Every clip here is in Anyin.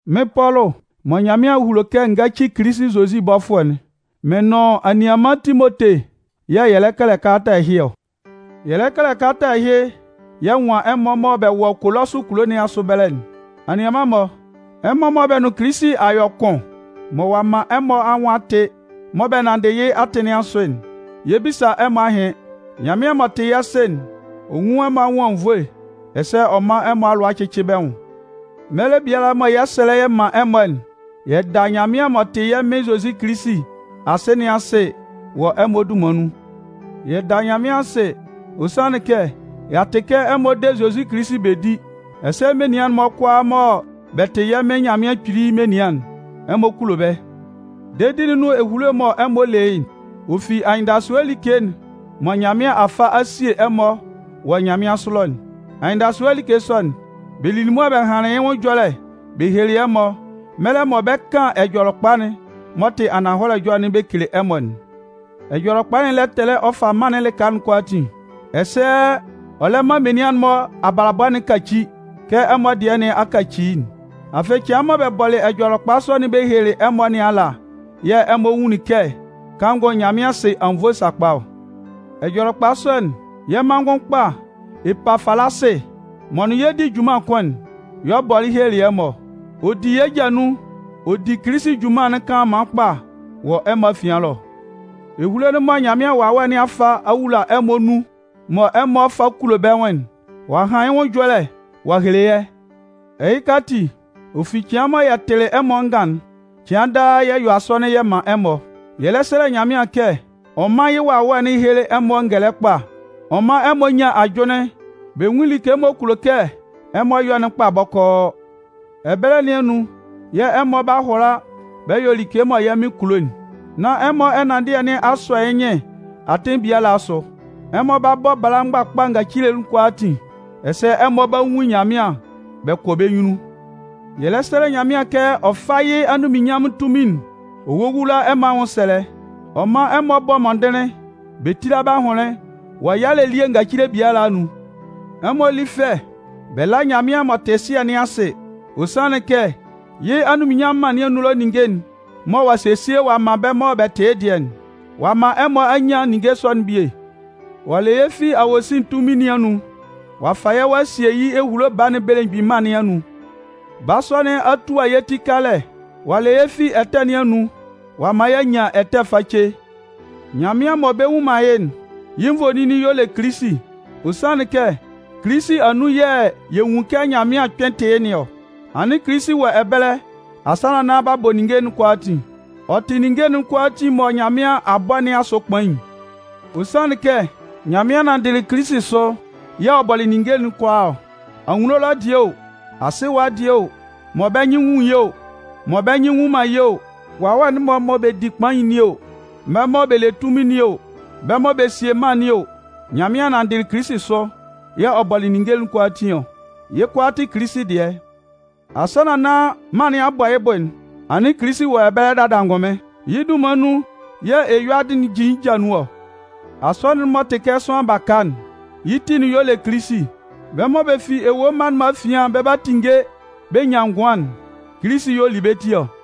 Mɩ́n Pɔlʋ mɔ Nyanmɩan a hulo kɛ n gáci Kilisi Zozi bɔfʋɛ'n, mɩn nʋn anianman Timote yɛ̂ yɛ lɛ kɛlɛ kalata ɛhɩ ɔ. Yɛ lɛ kɛlɛ kalata ɛhɩ yɛ nwan ɛmɔ mɔ bɛ wɔ Kolɔsʋ kulo nɩn asʋ ɛbɛlɛ'n. Anianman-mɔ, ɛmɔ mɔ bɛ nʋn Kilisi a yɔ kʋn, mɔ ɔ'a man ɛmɔ anwʋn a tɩ, mɔ bɛ nanndɩ yɩ́ atɩn nɩn asʋ'n, yɛ 'bisa ɛmɔ ahɩn. Nyanmɩan m'ɔ tɩ yɛ́ Sɩ'n, ɔ nwún ɛmɔ anwʋn anwunnvoe, ɛsɛ ɔ mán ɛmɔ alʋa cɩ́cɩ bɛ́ nwʋn. Mɛlɛ biala mɔ yɛ 'sɛlɛ yɛ man ɛmɔ'n, yɛ da Nyanmɩan m'ɔ tɩ yɛ́ Mɩn Zozi Kilisi Asɩ nɩn asɩ wɔ ɛmɔ dunman nun. Yɛ da Nyanmɩan asɩ, ɔ sanlɩn kɛ y'a tɩ kɛ ɛmɔ de Zozi Kilisi bɛ di, ɛsɛ menian'n-mɔ kʋalaa mɔ bɛ tɩ yɛ́ Mɩn Nyanmɩan Kpili menian'n, ɛmɔ kulo bɛ́. Dedi'n nʋn ehulo'n mɔ ɛmɔ le yɩ́'n, ɔ fi anyɩndasʋɛ like'n mɔ Nyanmɩan a fa a sie ɛmɔ wɔ nyanmɩansʋ ɛlɔ'n. Anyɩndasʋɛ like sɔ'n, bɛ lili mʋa bɛ hanlɩn yɩ́ nwʋn ɛjɔlɛ bɛ helelɩ ɛmɔ mɛlɛ mɔ bɛ 'kan Ɛjɔlɛkpa'n m'ɔ tɩ ananhɔlɛ ɛjɔlɛ'n bɛ kele ɛmɔ'n. Ɛjɔlɛkpa'n lɛ tɛlɛ ɔ fa mân'n lɩka kʋalaatin, ɛsɛ ɔ lɛ man menian'n-mɔ abalabɔ'n kaci kɛ ɛmɔ dɩɛ nɩn a kaci'n. Afɩ cɩan mɔ bɛ bɔlɩ Ɛjɔlɛkpa sɔ'n bɛ helelɩ ɛmɔ nɩn ala yɛ̂ ɛmɔ nwunlin kɛ kanngʋ Nyanmɩan sɩ anwunnvoe sakpa ɔ. Ɛjɔlɛkpa sɔ'n, yɛ́ manngʋn kpa Epafalasɩ m'ɔ nʋn yɛ di junman kʋn'n, y'ɔ bɔlɩ helelɩ ɛmɔ ɔ. Ɔ di yɛ́ ja nun ɔ di Kilisi junman'n kanlanman kpa wɔ ɛmɔ afian ɛlɔ. Ehulo'n mɔ Nyanmɩan Wawɛ nɩn a fa a wula ɛmɔ anun, mɔ ɛmɔ fa kulo bɛ́ nwʋn'n, ɔ'a han yɩ́ nwʋn ɛjɔlɛ ɔ'a hele yɛ́. Ɛhɩka ati, ɔ fi cɩan mɔ yɛ tɩlɩ ɛmɔ angan'n, cɩan daa yɛ yɔ asɔnɩn yɛ man ɛmɔ. Yɛ lɛ sɛlɛ Nyanmɩan kɛ ɔ mán yɩ́ Wawɛ'n héle ɛmɔ ngɛlɛ kpa ɔ mán ɛmɔ nyán ajʋnlɩn bɛ nwún like m'ɔ kulo kɛ ɛmɔ yɔ'n kpa bɔkɔɔ. Ɛbɛlɛ nɩn anun yɛ̂ ɛmɔ 'ba hʋala bɛ yɔ like mɔ yɛ́ Mɩn kulo'n, nán ɛmɔ ɛnanndɩɛ nɩn a sɔ yɩ́ nyɩn atɩn biala asʋ. Ɛmɔ 'ba bɔ bala mgbakpa ngacile'n kʋalaatin, ɛsɛ ɛmɔ 'ba nwun Nyanmɩan bɛ kɔ bɛ́ nyunnun. Yɛ lɛ sɛlɛ Nyanmɩan kɛ ɔ fá yɩ́ anunminnyanmʋn tunmin'n ɔ wówula ɛmɔ anwʋnsɛlɛ, ɔ mán ɛmɔ bɔ́ mɔndɩnlɩn bɛ tíla bɛ́ ahʋnlɩn wɔ yalɛ elie ngacile biala anun. Ɛmɔ lí fɛ bɛ lá Nyanmɩan m'ɔ tɩ Sɩɛ nɩn asɩ. Ɔ sanlɩn kɛ yɩ́ anunminnyanmʋn mân nɩn anun ninnge'n mɔ ɔ'a sesie ɔ'a man bɛ́ mɔ bɛ tɩ yɩ́ dɩɛ'n, ɔ'a man ɛmɔ a nyan ninnge sɔ'n bie. Ɔ'a le yɛ́ fi awosin tunmin nɩn anun, ɔ'a fa yɛ́ ɔ'a sie yɩ́ ehulo Baa'n belemgbin mân nɩn anun. Baa sɔ'n, ɔ'a tua yɛ́ ti kalɛ ɔ a le yɛ́ fi ɛtɛ nɩn anun ɔ'a man y'a nyan ɛtɛ face. Nyanmɩan mɔ bɛ nnwun man yɩ́'n, yɩ́ nvoninnin y'ɔ le Kilisi. Ɔ sanlɩn kɛ Kilisi anun yɛ̂ yɛ nwun kɛ Nyanmɩan kpɩn tɩ yɩ́ nɩn ɔ. Anɩn Kilisi wɔ ɛbɛlɛ asannan nán b'a bɔ ninnge'n kʋalaatin. Ɔ tɩ ninnge'n kʋalaatin mɔ Nyanmɩan a bɔ nɩn asʋ kpain. Ɔ sanlɩn kɛ Nyanmɩan nanndɩ Kilisi sʋ yɛ̂ ɔ bɔlɩ ninnge kʋalaa ɔ. Anwunno ɛlɔ dɩɛ o, asɩ ɛwa dɩɛ o, mɔ bɛ́ nyɩn nwun yɩ́ o, mɔ bɛ́ nyɩn nnwun man yɩ́ o, wawɛ'n-mɔ mɔ bɛ di kpain nɩn o, bɛ́ mɔ bɛ le tunmin nɩn o, bɛ́ mɔ bɛ sie mân nɩn o, Nyanmɩan nanndɩ Kilisi sʋ yɛ̂ ɔ bɔlɩ ninnge'n kʋalaatin ɔ. Yɩ́ kʋalaa tɩ Kilisi dɩɛ. Asannan nán mân nɩn a bɔ yɩ́ bʋ'n, anɩn Kilisi wɔ ɛbɛlɛ dada angʋnmɩn. Yɩ́ dunman nun yɛ̂ eyuadɩ'n jin yɩ́ ja nun ɔ. Asɔnɩn'n m'ɔ tɩ kɛ sʋanlan baka'n, yɩ́ ti'n y'ɔ le Kilisi. Bɛ́ mɔ bɛ fi ewue mma'n-mɔ afian bɛ 'ba tinnge bɛ nyan ngʋan'n, Kilisi y'ɔ li bɛ́ ti ɔ.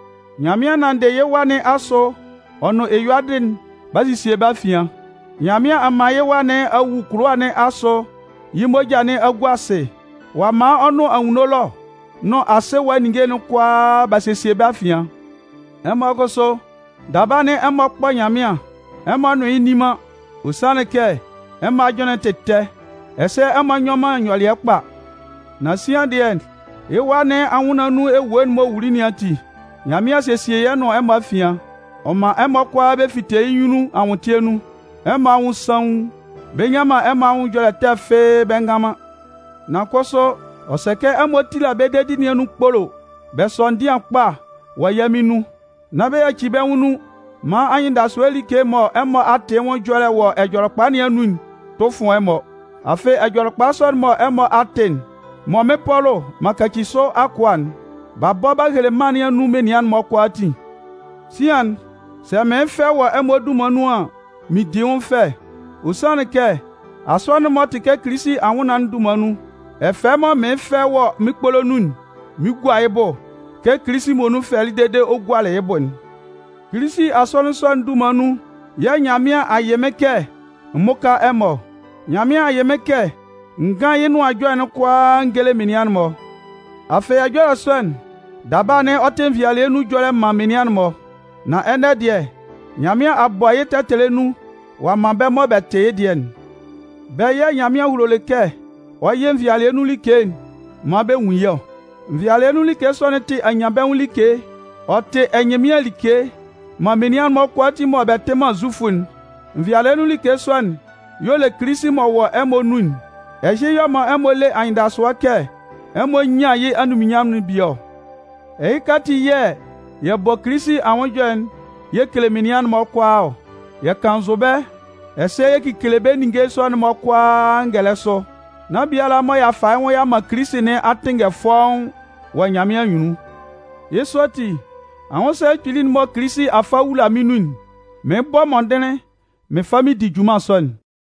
Nyanmɩan nanndɩ yɩ́ Wa nɩn asʋ ɔ nʋn eyuadɩ'n b'a sesie bɛ́ afian. Nyanmɩan a man yɩ́ Wa nɩn a wu kʋlʋwa nɩn asʋ yɩ́ moja nɩn a gua asɩ, ɔ'a man ɔ nʋn anwunno ɛlɔ nʋn asɩ ɛwa ninnge'n kʋalaa b'a sesie bɛ́ afian. Ɛmɔ kʋsʋ, daba anɩn ɛmɔ kpɔ Nyanmɩan ɛmɔ nʋn yɩ́ nni man. Ɔ sanlɩn kɛ ɛmɔ ajʋnlɩn'n tɩ ɛtɛ, ɛsɛ ɛmɔ nyɔ man nyɔlɩɛ kpa. Nan sian dɩɛ, yɩ́ Wa nɩn anwʋnnaan nun ewue'n m'ɔ wuli nɩn ati, Nyanmɩan a sesie yɩ́ nʋn ɛmɔ afian. Ɔ man ɛmɔ kʋala bɛ fite yɩ́ nyunnun anwʋntɩɛ nun, ɛmɔ anwʋn saun, bɛ nnyan man ɛmɔ anwʋn ɛjɔlɛ ɛtɛ fɩ́ɩ́ bɛ ngan man. Nan kʋsʋ, ɔ sɛ kɛ ɛmɔ tíla bɛ́ dedi nɩn anun kpolo bɛ sɔ́ ndɩan kpa wɔ yɛ́ Mɩn nun. Nán bɛ yaci bɛ́ nwʋn nun maan anyɩndasʋɛ like'n mɔ ɛmɔ a tɩ yɩ́ nwʋn ɛjɔlɛ wɔ Ɛjɔlɛkpa nɩn anun'n tʋ fʋn ɛmɔ. Afɩ Ɛjɔlɛkpa sɔ'n mɔ ɛmɔ a tɩ'n, mɔ mɩ́n Pɔlʋ m'an kaci sʋ akʋa'n, b'a bɔ b'a hele mân nɩn anun menian'n-mɔ kʋalaatin. Sian'n, sɛ mɩɩn fɛ wɔ ɛmɔ dunman nun an, mɩn di yɩ́ nwʋn fɛ. Ɔ sanlɩn kɛ Asɔnɩn'n m'ɔ tɩ Kilisi anwʋnnaan'n dunman nun, ɛfɛ mɔ mɩɩn fɛ wɔ mɩ́n kpolo nun'n, mɩn 'gua yɩ́ bʋ kɛ Kilisi muonun fɛlɩ dede ɔ gualɩ yɩ́ bʋ'n. Kilisi Asɔnɩn sɔ'n dunman nun yɛ̂ Nyanmɩan a yɩ mɩ́n kɛ m mʋ́ka ɛmɔ ɔ. Nyanmɩan a yɩ mɩ́n kɛ n gán yɩ́ Nʋan Ɛjɔlɛ'n kʋalaa n géle menian'n-mɔ. Afɩ ɛjɔlɛ sɔ'n, daba anɩn ɔ tɩ nvɩalɩɛ nun ɛjɔlɛ man menian'n-mɔ. Nan ɛnɛ dɩɛ, Nyanmɩan a bɔ yɩ́ tɛtɛlɛ nun ɔ'a man bɛ́ mɔ bɛ tɩ yɩ́ dɩɛ'n. Bɛ́ yɛ̂ Nyanmɩan hulolɩ kɛ ɔ yɩ nvɩalɩɛ nun like'n maan bɛ nwun yɩ́ ɔ. Nvɩalɩɛ nun like sɔ'n tɩ anyanbɛnwʋn like, ɔ tɩ ɛnyɩnmɩan like man menian'n-mɔ kʋalaatin mɔ bɛ tɩ man Zufʋ'n. Nvɩalɩɛ nun like sɔ'n y'ɔ le Kilisi m'ɔ wɔ ɛmɔ nun'n. Ɛhɩ y'ɔ man ɛmɔ le anyɩndasʋɛ kɛ ɛmɔ 'nyan yɩ́ anunminnyanmʋn'n bie ɔ. Ɛhɩka ati yɛ̂ yɛ bɔ Kilisi anwʋn ɛjɔlɛ'n yɛ kele menian'n-mɔ kʋalaa ɔ. Yɛ kannzʋ bɛ́, ɛsɛ yɛ kekele bɛ́ ninnge sɔ'n-mɔ kʋalaa ngɛlɛ sʋ, nán biala m'ɔ ɔ'a fa yɩ́ nwʋn ɔ'a man Kilisi nɩn a tɩnngɛ fɔ́ʋ́n wɔ Nyanmɩan anyunnun. Yɩ́ sɔ ati, anwʋnsɛlɛ kpili'n mɔ Kilisi a fa a wula mɩ́n nun'n, mɩɩn bɔ mɔndɩnlɩn mɩn fa mɩn di junman sɔ'n.